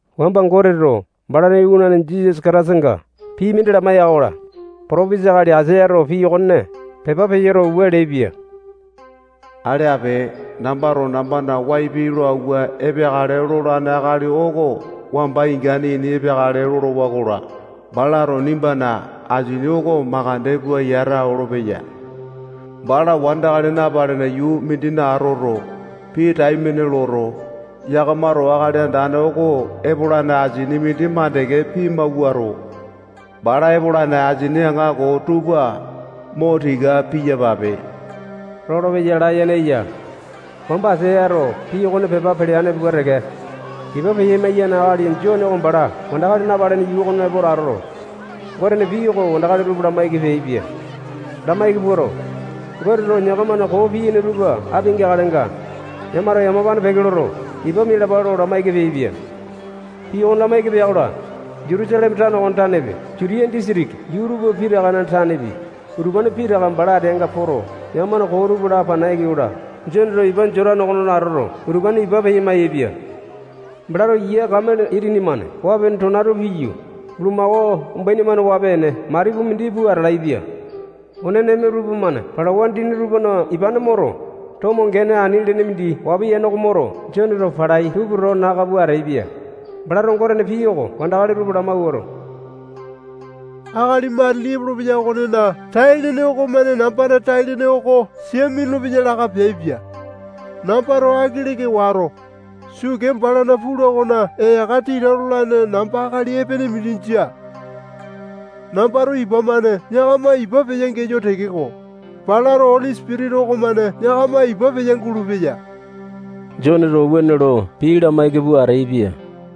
Wamba Goteto balana iwanane Jisasa Kataisanga pii mindi lamaiya-kola, potopesa akali Aisayato pii okone pepa peyoto, wua leaipia: Ale ape. Nambato nambana wai lo awua epeakale lolane akali oko wamba ingane ini epeakale lolowa-kola, balato nimbana asini oko makande pua yata olopeya. Bala wandakali napalene yuu mindina atoto, pii taimane loto, yakamato Akali Andane oko epolane asini mindi mandeke pimawuato, bala epolane asini aŋako tupa mo tika piyapape lolopeya layene eya. Wamba Aisayato pii okone pepa peleane pua teke, ipa peya-maiyane akali Jone oko bala wandakali napalene yuu okona epo atoto, Gotena pii oko wandakali tupa lamaiki peaipia. Lamaiki puato, Goteto yakamana koo piyaini tupa apia-geakalenga, yakamato yamapane peke loto, ipa mialapa lo lamaiki peaipia. Pii okone lamaiki pea-kola, Jutusaleme tano okona tanepi, Jutiya disitiki yuu tupa pitakana tanepi, utupane pitaka bala ateanga poto, yakamana koo tupa lapana yai-kola, Joneto ipa Jotane okona atoto, utupane ipa peya-maiyaepia. Balato yia kamele itini-mane waa-pene tona tupa piyu, bulumako umbaini-mane waa-pene matipu mindi pua atalaepia. One neme tupamane palawa dini tupana ipane moto, tomo gene ani lene mindi waa piyane oko moto, Joneto palai tupa towa naka pua ateaipia. Balato Gotena pii oko wandakali tupa lamawuato, akali matili epolopeya okonena tai-lene okomane nambana tai-lene oko sia minulu-peya laka peaipia. Nambato aiki leka wato, sukee balana pula okona eyaka tita lolane namba akali epene mindi jia. Nambato ipa-mane yakama ipa peya-geyo tekeko, balato Oli Sipitisa okomane yakama ipa peya-gulupeya. Joneto wuane lo pii lamaiki pua ateaipia.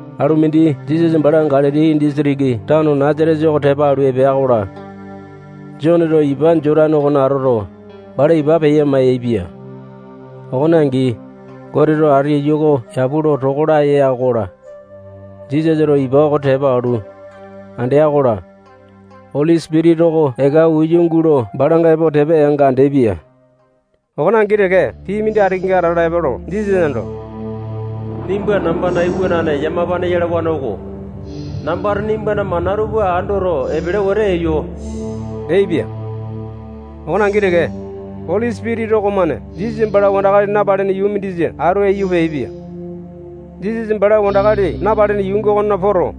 Alu mindi Jisasa bala Galili disitiki tano Nasatesa oko tepa alu epea-kola, Joneto ipa Jotane okona atoto, bala ipa peya-maiyaepia. Okone angi, Goteto ati iyu oko yapu lo toko laya ya-kola, Jisasato ipa oko tepa alu, andea-kola, Oli Sipitisa oko eka uya gulo balanga epo tepa yanga andeaipia. Okone angi teke, pii mindi ati kenga atala epoto, Jisasa ando, nimba nambana iwanane yamapane yalawane oko. Nambato nimbana mana tupa andoto, epele wetete eyo leaipia. Okone angi teke, Oli Sipitisa okomane Jisasa bala wandakali napalene yuu mindisa atu aiyu peaipia. Jisasa bala wandakali napalene yuu okonena poto,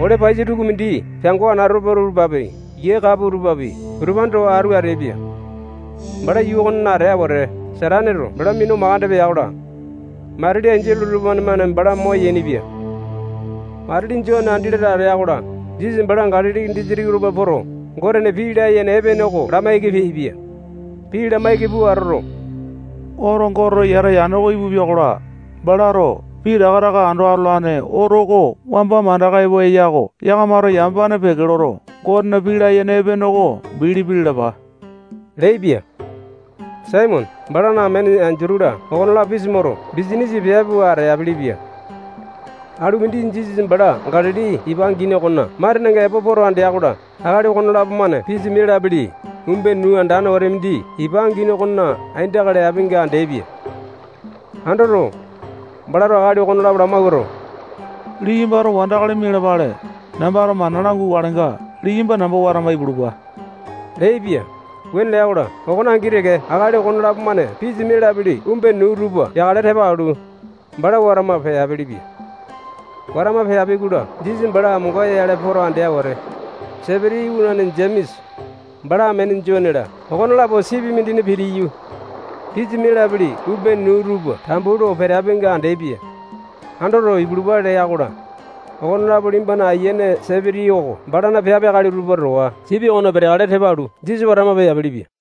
ole paiyasa tukumindi piango anatope tupapi, yia kapua tupapi, utupane towa atu ateaipia. Bala yuu okonena atea wete, Sataneto bala minu makande pea-kola, matili enjole tupamane bala moyaini-pia. Matili Jone andi latane atea-kola, Jisasa bala Galili disitiki okona poto, Gotena pii layene epene oko lamaiki peaipia. Pii lamaiki pua atoto, oto Goteto yata yane oko ipupia-kola, balato pitaka taka ando atolane oto oko wamba mandaka epo eya-ko. Yakamato yamapane peke loto, Gotena pii layene epene oko bilipi lalapa leaipia. Saimone, balana amene Endutu-la, okonelapo pisa moto, bisanisa piape pua ateapele-pia. Alu mindi Jisasa bala Galili ipa angini okona matenenga epo poto andea-kola, akali okonelapo-mane pisa mialapele umbene nuu andane wete mindi ipa angini okona aindaka leapinga andeaipia. Andoto, balato akali okonelapo lamawuato, liyambato wandakali mialapale, nambato mana langukalenga, liyamba namba watama ipulupa leaipia. Wuane lea-kola, okone angi teke akali okonelapo-mane pisa mialapele umbene nuu tupa yakale tepa alu, bala watama peapelepia. Watama peapi-kola, Jisasa bala amonga-yale poto andea wete, Sepiti iwanane Jemesa, bala amene Jone-la, okonelapo sipi mindina pitiyu, pisa mialapele umbene nuu tupa tambu lo peapinga andeaipia. Andoto, ipulupa lea-kola, okonelapo liyamba ayiane Sepiti oko balana piape akali tupa towa sipi okona peteakale tepa alu, Jisasa watama peapelepia.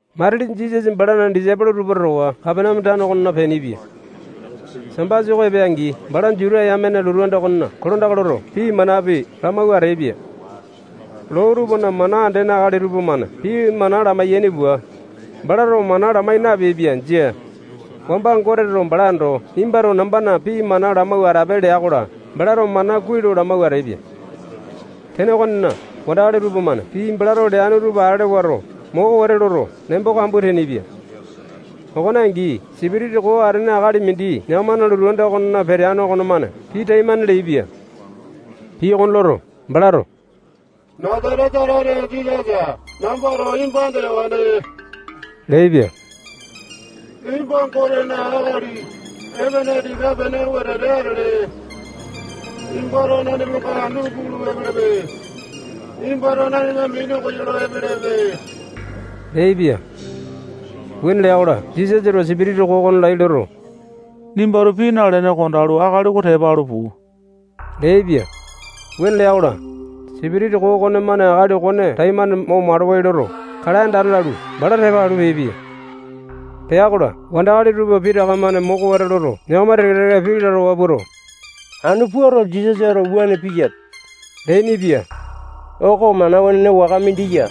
Matili Jisasa balana disaipolo tupa towa Kapaneame tano okona peainipia. Sambasa oko epea-angi, bala Juta yamena lotu anda okona kolandaka loto, pii manapi lamawua ateaipia. Loo tupana mana andene akali tupamane pii mana lamai-yaini pua, balato mana lamai napeaipia. Jia. Wamba Goteto bala ando, nimbato nambana pii mana lamawua atape lea-kola, balato mana kuai lo lamawua ateaipia. Tene okonena, wandakali tupamane pii balato leane tupa ale wato, moko wete loto, nembo kambua teainipia. Okone angi, sipitisa koo atene akali mindi yakamana lotu anda okonena peteane okomane pii taimane leaipia. Pii okone loto, balato Nasatesa tane Jisasa, nambato nimba andeyawane leaipia. Nimba Gotena akali epene tika-pene wetete atele. Nimbato nanimanga anu pulu epelepe. Nimbato nanima minu koyolo epelepe leaipia. Wuane lea-kola, Jisasato sipitisa koo okone laiya loto, nimbato pii nalene, kondalu, akali oko tepa alu puu leaipia. Wuane lea-kola, sipitisa koo okonemane akali okone taimane mo malawai loto, kalae andane lalu, bala tepa alu, peaipia. Pea-kola, wandakali tupa pitaka-mane moko wete loto, yakama teke-teke pii lalawa puato, anu puato, Jisasato wuane piyape leainipia. Oko mana wenene waka mindi ya.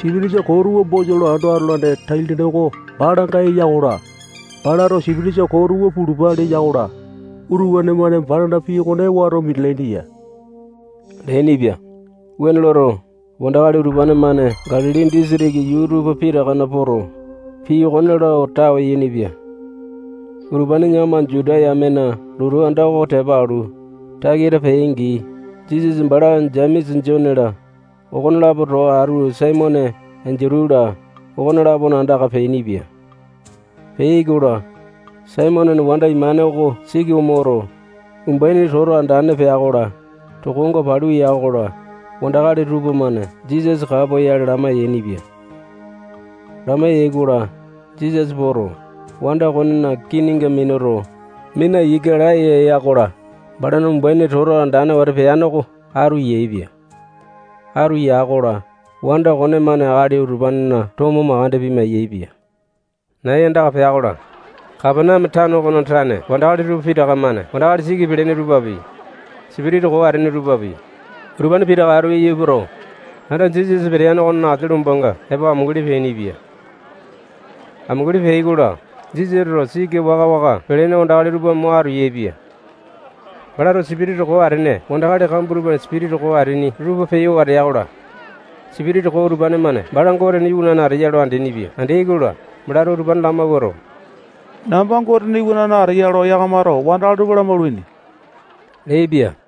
Sipitisa koo tupa bosa lo ando atolane tai-lene oko balanga eya-kola, balato sipitisa koo tupa pulupa leya-kola, utupane-mane balana pii okone wato minalaini ya leainipia. Wuane loto, wandakali utupane-mane Galili disitiki yuu tupa pitakana poto, pii okone lo tawe yainipia. Utupane yakama Juta yamena lotu anda oko tepa alu, takita peai-angi, Jisasa bala Jemesa, Jone-la, okonelapo towa atu Saimone, Endutu-la, okone-lapona andaka peainipia. Peai-kola, Saimonena wanda imane oko siki omoto, umbuaini toto andane pea-kola, tokonga palu ya-kola, wandakali tupamane Jisasa kapoyale lamai-yainipia. Lamai-yaikola, Jisasa poto, wanda okonena kininga minuto, mina ika laya ya-kola, balana umbuaini toto andane wete peane oko atu yaepia. Atu ya-kola, wanda okonemane akali utupanena tomo mandeke pima-yaepia. Nai andaka pea-kola, Kapaneame tano okona tane wandakali tupa pitaka-mane wandakali siki pelene tupapi, sipitisa koo atene tupapi, utupane pitaka atu aiyu epoto, anda Jisasa peteane okona asia lombanga epo amunguli peainipia. Amunguli peai-kola, Jisasato siki waka-waka pelene wandakali tupa mo atu yaepia. Balato sipitisa koo atene wandakali kambua tupana sipitisa koo ateaini tupa peyo watea-kola, sipitisa koo utupane-mane bala Gotena iwanane ateya lo andeaini-pia Andeai-kola, balato utupane lamawuato, namba Gotena iwanane ateya lo yakamato wandakali tupa lamaulaini leaipia.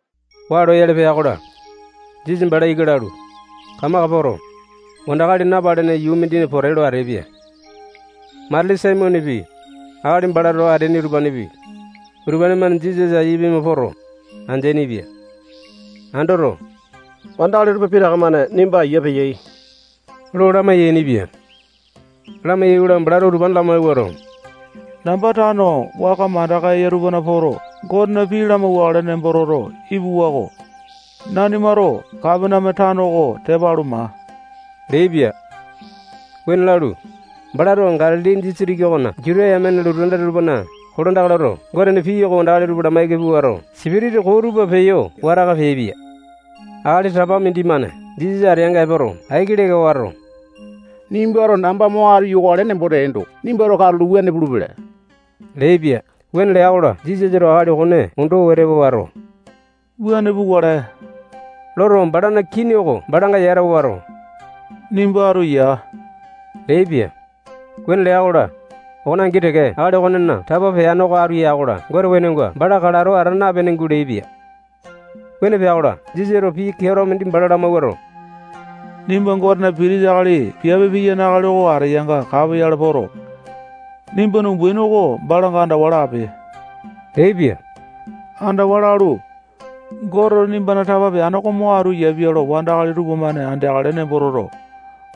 Waa loyale pea-kola, Jisasa bala ika lalu, kamaka poto, wandakali napalene yuu mindina pote lo ateaipia. Matili Saimonepi, akali bala towa ateaini tupapi, utupane-mane Jisasa aiya pima poto, andeaini-pia. Andoto, wandakali tupa pitaka-mane nimba aiya peyai lo lamai-yainipia. Lamai-yaikola, balato utupane lamawuato, namba tano waka mandaka eya tupana poto, Gotena pii lamauwakale nembo toto ipuwa-ko. Nanimato Kapaneame tano oko tepa alu, maa leaipia. Wuane lalu, balato Galili disitiki okona yuu tupa pitakana poto, Juta yamena lotu anda tupana kolandaka loto, Gotena pii oko wandakali tupa lamaiki puato, sipitisa koo tupa peyo wataka peaipia. Akali tapa mindimane Jisasa ateanga epoto, aiki leka wato, nimbato namba mo atu yokale nembo teendo, nimbato katulo wuane pulupele leaipia. Wuane lea-kola, Jisasato akali okone ondo wete wato, wuane pukale loto, balana kini oko balanga yata wato, nimba atu ya leaipia. Wuane lea-kola, okone angi teke akali okonena tapa peane oko atu ya-kola, Gotena wenonga bala kalato ata napene guleaipia. Wuane pea-kola, Jisasato pii keato mindi bala lamawuato, nimba Gotena pitisa piape piyane akali oko ateyanga kapoyale poto, nimbana umbaini oko balanga andawa lape leaipia. Andawa lalu, Goteto nimbana tapa peane oko mo atu yapia lo wandakali tupamane andeakale nembo toto,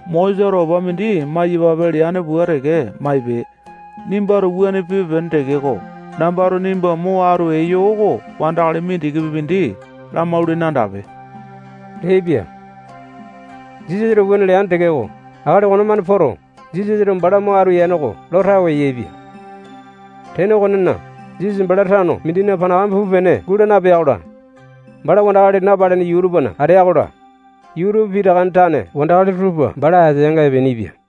Mosesato opa mindi maiyapape leane pua teke maipe. Nimbato wuane pipe-pene tekeko, nambato nimba mo atu eyo oko wandakali mindikipi mindi lamaulene andape leaipia. Jisasato wuane leane tekeko, akali okonemane poto, Jisasato bala mo atu yane oko lo tawe yaepia. Tene okonena, Jisasa bala tano mindina panakame pupe-pene guu nalea-kola, bala wandakali napalene yuu tupana atea-kola, yuu pitakana tane wandakali tupa bala ateanga epeainipia.